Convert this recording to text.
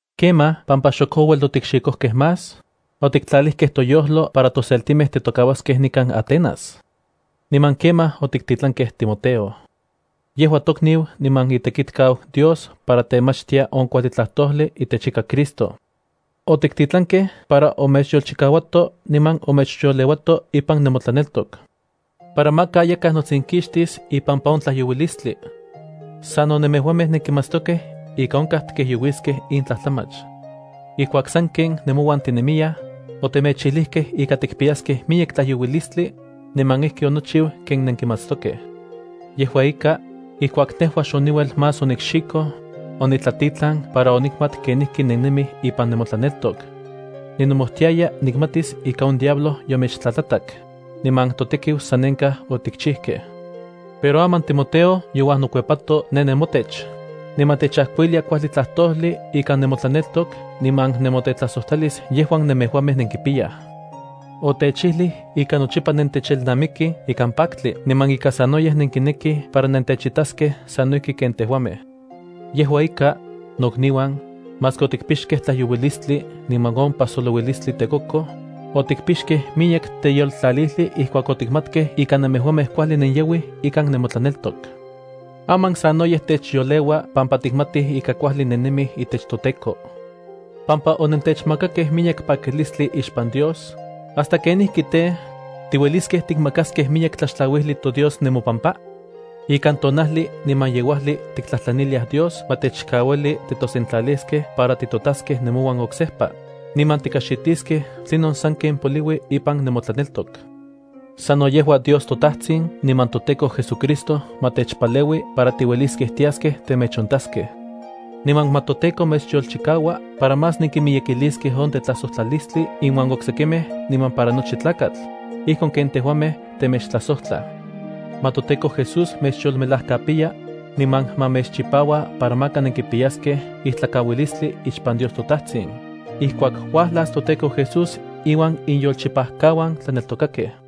Kemaj pampa xok ouel otikxikojkej más, otiktlalijkej toyojlo para toseltimej titokauaskej nikan Atenas, niman kemaj otiktitlankej Timoteo. Yejua tokniu niman itekitkau Dios para temachtia on kuajli tlajtojli itech ika Cristo. Otiktitlankej para omechyolchikauato niman omechyoleuato ipan nemotlaneltok, para maka yakaj notsinkixtis ipampa on tlajyouilistli. Sano nemejuamej nenkimatstokej ika onkaj tikijyouiskej in tlajtlamach. Ijkuak sanken nemouan tinemiyaj, otemechijlijkej ika tikpiyaskej miyek tlayouilislti, niman ijki onochiu ken nenkimatstokej. Yejua ika, ijkuak nejua xoniuel más onikxikoj, onitlatitlan para onikmat kenijki nennemij ipan nemotlaneltok. Ninomojtiaya nikmatis ika on diablo yomechtlatlatak, niman totekiu sanenkaj otikchijkej. Pero aman Timoteo youajnokuepato ne nemotech, niman techajkuilia kuajli tlajtojli ikan nemotlaneltok niman nemotetlajsojtlalis yejuan nemejuamej nenkipiyaj. Otechijlij ika nochipa nentechelnamikij ikan paktli, niman ika sanoyej nenkinekij para nentechitaskej sano ijki ken tejuamej. Yejua ika, nokniuan, maski otikpixkej tlajyouilistli niman on pajsolouilistli tekokoj, otikpixkej miyek teyoltlalijli ijkuak otikmatkej ika nemejuamej kuajli nenyauij ikan nemotlaneltok. Aman sanoyej techyoleua pampa tikmatij ika kuajli nennemij itech toTEKO. Pampa onentechmakakej miyek pakilistli ixpan Dios, ¿hasta kenijki tej, tiueliskej tikmakaskej miyek tlaxtlauijli toDios nemopampa? Ikan tonajli niman yeuajli tiktlajtlaniliaj Dios ma techkauili titosentlaliskej para titotaskej nemouan oksejpa, niman tikajxitiskej tlinon sanken poliui ipan nemotlaneltok. Sano yejua Dios toTajtsin niman toTEKO JesuCristo ma techpaleui para tiueliskej tiaskej temechontaskej. Niman ma toTEKO mechyolchikaua para más nenkimiyekiliskej on tetlajsojtlalistli inuan oksekimej niman para nochi tlakatl, ijkon ken tejuamej temechtlajsojtlaj. Ma toTEKO Jesús mechyolmelajkapiya, niman ma mechchipaua para maka nenkipiyaskej ijtlakauilistli ixpan Dios toTajtsin, ijkuak uajlas toTEKO Jesús iuan iyolchipajkauan tlaneltokakej.